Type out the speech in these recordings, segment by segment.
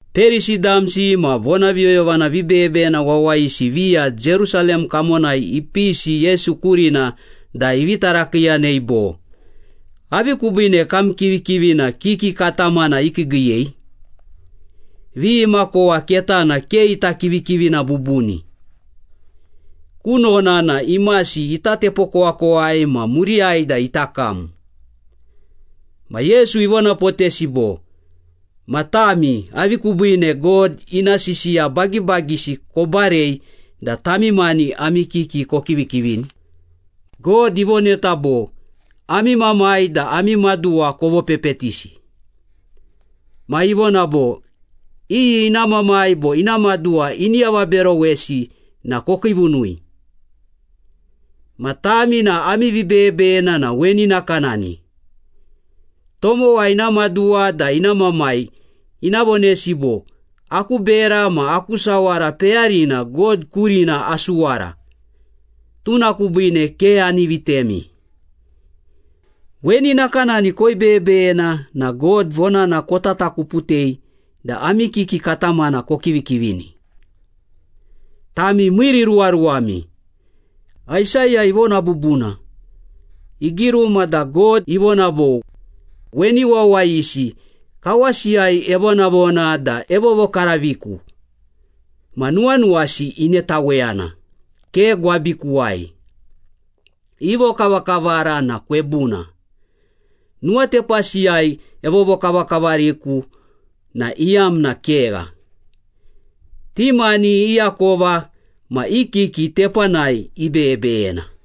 Perisi damsi ma vonaviyoyovana vibeyebeyena wawayisi viya Jerusalem kamonai ipisi Yesu kurina da ivi tarakiiyanei bo, “Avi kubiine kam kivikivina kiki katamana ikiigiiyei? Vi imakowa ketana ke ita kivikivina bubuni. Kunona na imasi ita tepokowakowai ma muriyai da ita kam.” Ma Yesu ivonapotesi bo, “Ma tami, avi kubiine God ina sisiya bagibagisi kobarei da tami mani ami kiki kokivikivini? God ivoneta bo, ‘Ami mamai da ami maduwa kovopepetisi.’ Ma ivona bo, ‘Iyi ina mamai bo ina maduwa ini avaberowesi na kokiivunui.’ Ma tami na ami vibeyebeyena na weni nakanani. Tomowa ina maduwa da ina mamai ina vonesi bo, ‘Aku bera ma aku sawara peyarina God kurina asuwara. Tuna kubiine ke ani vitemi.’ Weni nakanani koibeyebeyena na God vonana kotatakuputei da ami kiki katamana kokivikivini. Tami miiriruwaruwami! Aisaya ivona bubuna, igiruma da God ivona bo, ‘Weni wawayisi kawasiyai evonavona da evovokaraviku, Ma nuwanuwasi inetaweyana, ke gwabikuwai. I vokavakavara na kwebuna. Nuwatepasiyai evovokavakavariku na iyamna kegha. Ti mani i akova ma i kiki tepanai ibeyebeyena.’”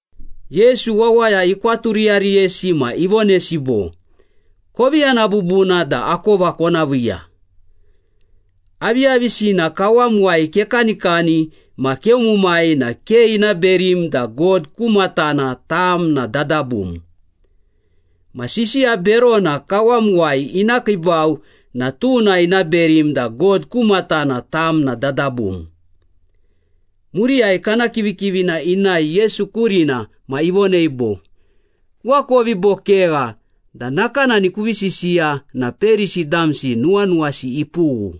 Yesu wawaya ikwaturiyariyesi ma ivonesi bo, “Kovi yana bubuna da akova kona viiya. Aviyavisina kawamuwai kekanikani ma keumumai na ke ina berim da God ku matana tam na dadabum. Ma sisiya berona kawamuwai ina kiibau na tuna ina berim da God ku matana tam na dadabum.” Muriyai kana kivikivina inae Yesu kurina ma ivonei bo, “Kuakovi bo kegha da nakanani kuvi sisiya na Perisi damsi nuwanuwasi ipughu.”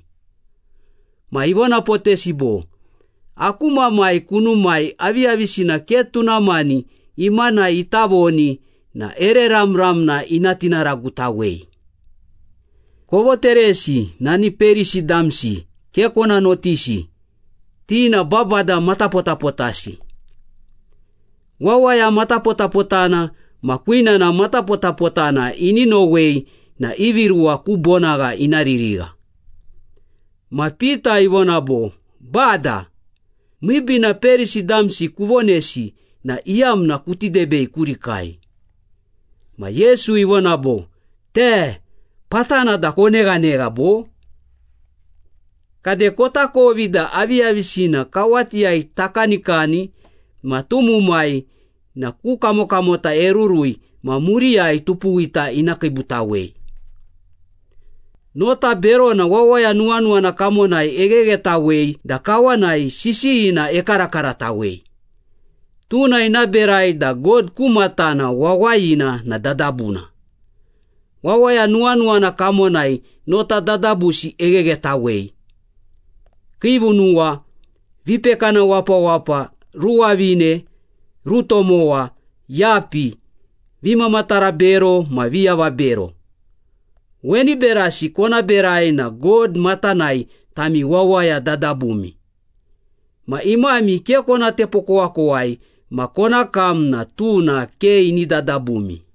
Ma ivonapotesi bo, “Aku Mamai kunumai aviyavisina ke tuna mani imanai ita voni na ere ramramna ina tinaragutawei. Kovoteresi, nani Perisi damsi ke kona notisi, ti na babada matapotapotasi. Wawaya matapotapotana ma kwinana matapotapotana ini nowei na ivi ruwa ku bonagha ina ririgha.” Ma Pita ivona bo, “Bada, miibiina Perisi damsi kuvonesi na iyamna kuti debei kurikai.” Ma Yesu ivona bo, “Te! Patana da koneghanegha bo? Kade kotakovi da aviyavisina kawatiyai takanikani ma tumumai na ku kamokamota erurui ma muriyai tupuwita ina kiibutawei. Nota berona wawaya nuwanuwana kamonai egheghetawei da kawanai sisiyina ekarakaratawei. Tuna ina berai da God ku matana wawayina na dadabuna. Wawaya nuwanuwana kamonai nota dadabusi egheghetawei. Kiivunuwa, vipekana wapawapa, ruwavine, rutomowa, yapi, vimamatara bero ma viavabero. Weni berasi kona berai na God matanai tami wawaya dadabumi. Ma imami ke kona tepokowakowai ma kona kam na tuna ke ini dadabumi.”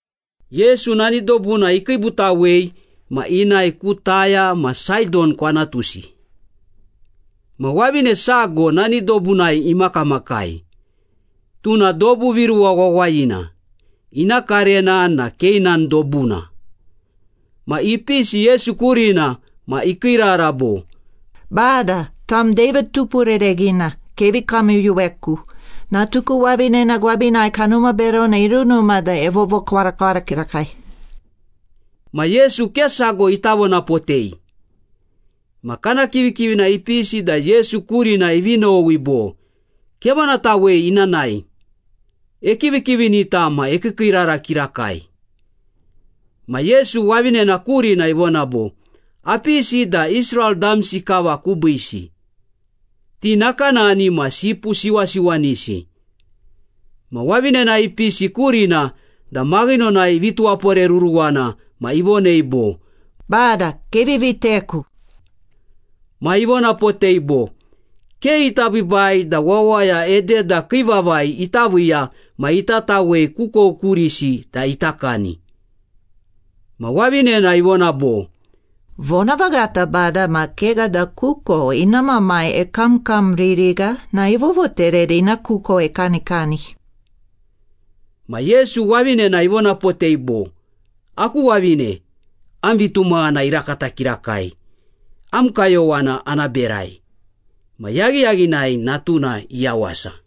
Yesu nani dobuna ikiibutawei ma inae ku Taya ma Saidon kwantusi. Ma wavine sago nani dobunai imakamakai, tuna dobu viruwa wawayina, ina karena na Keinan dobuna. Ma ipisi Yesu kurina ma ikiirara bo, “Bada, tam David Tupurereghina, kevi kamyuyuweku! Natuku wavinena gwabinai kanuma berona irunuma da evovokwarakwara kirakai.” Ma Yesu ke sago ita vonapotei. Ma kana kivikivina ipisi da Yesu kurina ivi nowi bo, “Kevonatawei ina nae, ekivikivinita ma ekiikiirara kirakai.” Ma Yesu wavinena kurina ivona bo, “Apisi da Israel damsi kava kubiisi. Ti nakanani ma sipu siwasiwanisi.” Ma wavinena ipisi kurina da maghinonai ivi tuwaporeruruwana ma ivonei bo, “Bada, kevi viteku!” Ma ivonapotei bo, “Ke ita biibai da wawaya ededa kii vavai ita viiya ma ita tawei kukou kurisi da ita kani.” Ma wavinena ivona bo, “Vonavaghata Bada, ma kegha da kukou ina mamai ekamkamririgha na evovoterei da ina kukou ekanikani.” Ma Yesu wavinena ivonapotei bo, “Aku wavine, am vitumaghana irakata kirakai! Am kayowana ana berai.” Ma yaghiyaghinai natuna iyawasa.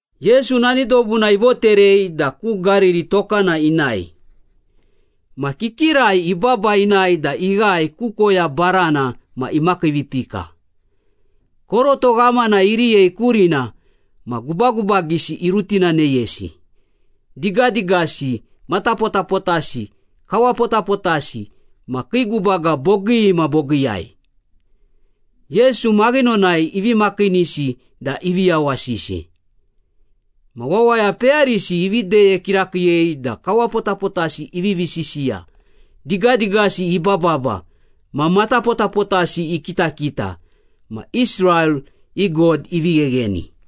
Yesu nani dobuna ivoterei da ku Gariri tokana inae. Ma kikirai ibaba inae da ighae ku koya barana ma imakiivipika. Koroto ghamana iriyei kurina ma gubagubagisi irutinaneyesi. Digadigasi, matapotapotasi, kawapotapotasi ma kii gubaga bogii ma bogiiyai. Yesu maghinonai ivi makiinisi da ivi yawasisi. Ma wawaya peyarisi ivi deye kirakiiyei da kawapotapotasi ivivi sisiya, digadigasi ibababa, ma matapotapotasi ikitakita. Ma Israel i God ivi ghegheni.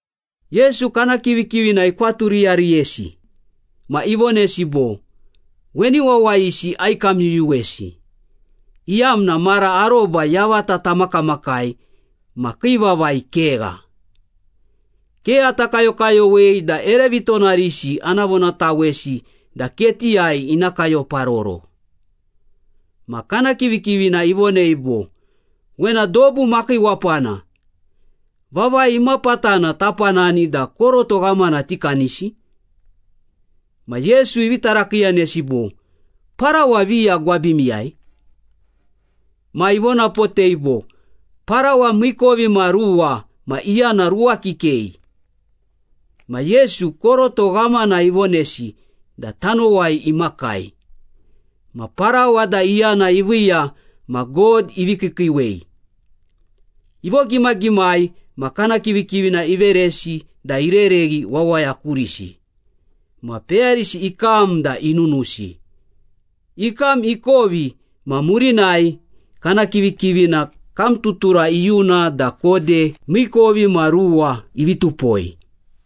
Yesu kana kivikivina ikwaturiyariyesi ma ivonesi bo, “Weni wawayisi aikamyuyuwesi, iyamna mara aroba yavata tamakamakai ma kii vavai kegha. Ke ata kayokayowei da ere vitonarisi ana vonatawesi da ketiyai ina kayoparoro.” Ma kana kivikivina ivonei bo, “Wena dobu makiiwapana. Vavai imapatana tapanani da koroto ghamana tikanisi?” Ma Yesu ivi tarakiiyanesi bo, “Parawa viya gwabimiyai?” Ma ivonapotei bo, “Parawa miikovimaruwa ma iyana ruwa kikei.” Ma Yesu, koroto ghamana ivonesi da tanowai imakai. Ma parawa da iyana iviiya ma God ivi kiikiiwei. Ivogimagimai ma kana kivikivina iveresi da irereghi wawaya kurisi. Ma peyarisi ikam da inunusi. Ikam ikovi ma murinai kana kivikivina kamtutura iyuna da kode miikovimaruwa ivi tupoi.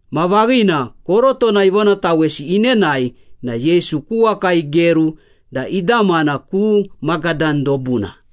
Ma vaghina, korotona ivonatawesi inenae na Yesu ku waka igeru da idamana ku Magadan dobuna.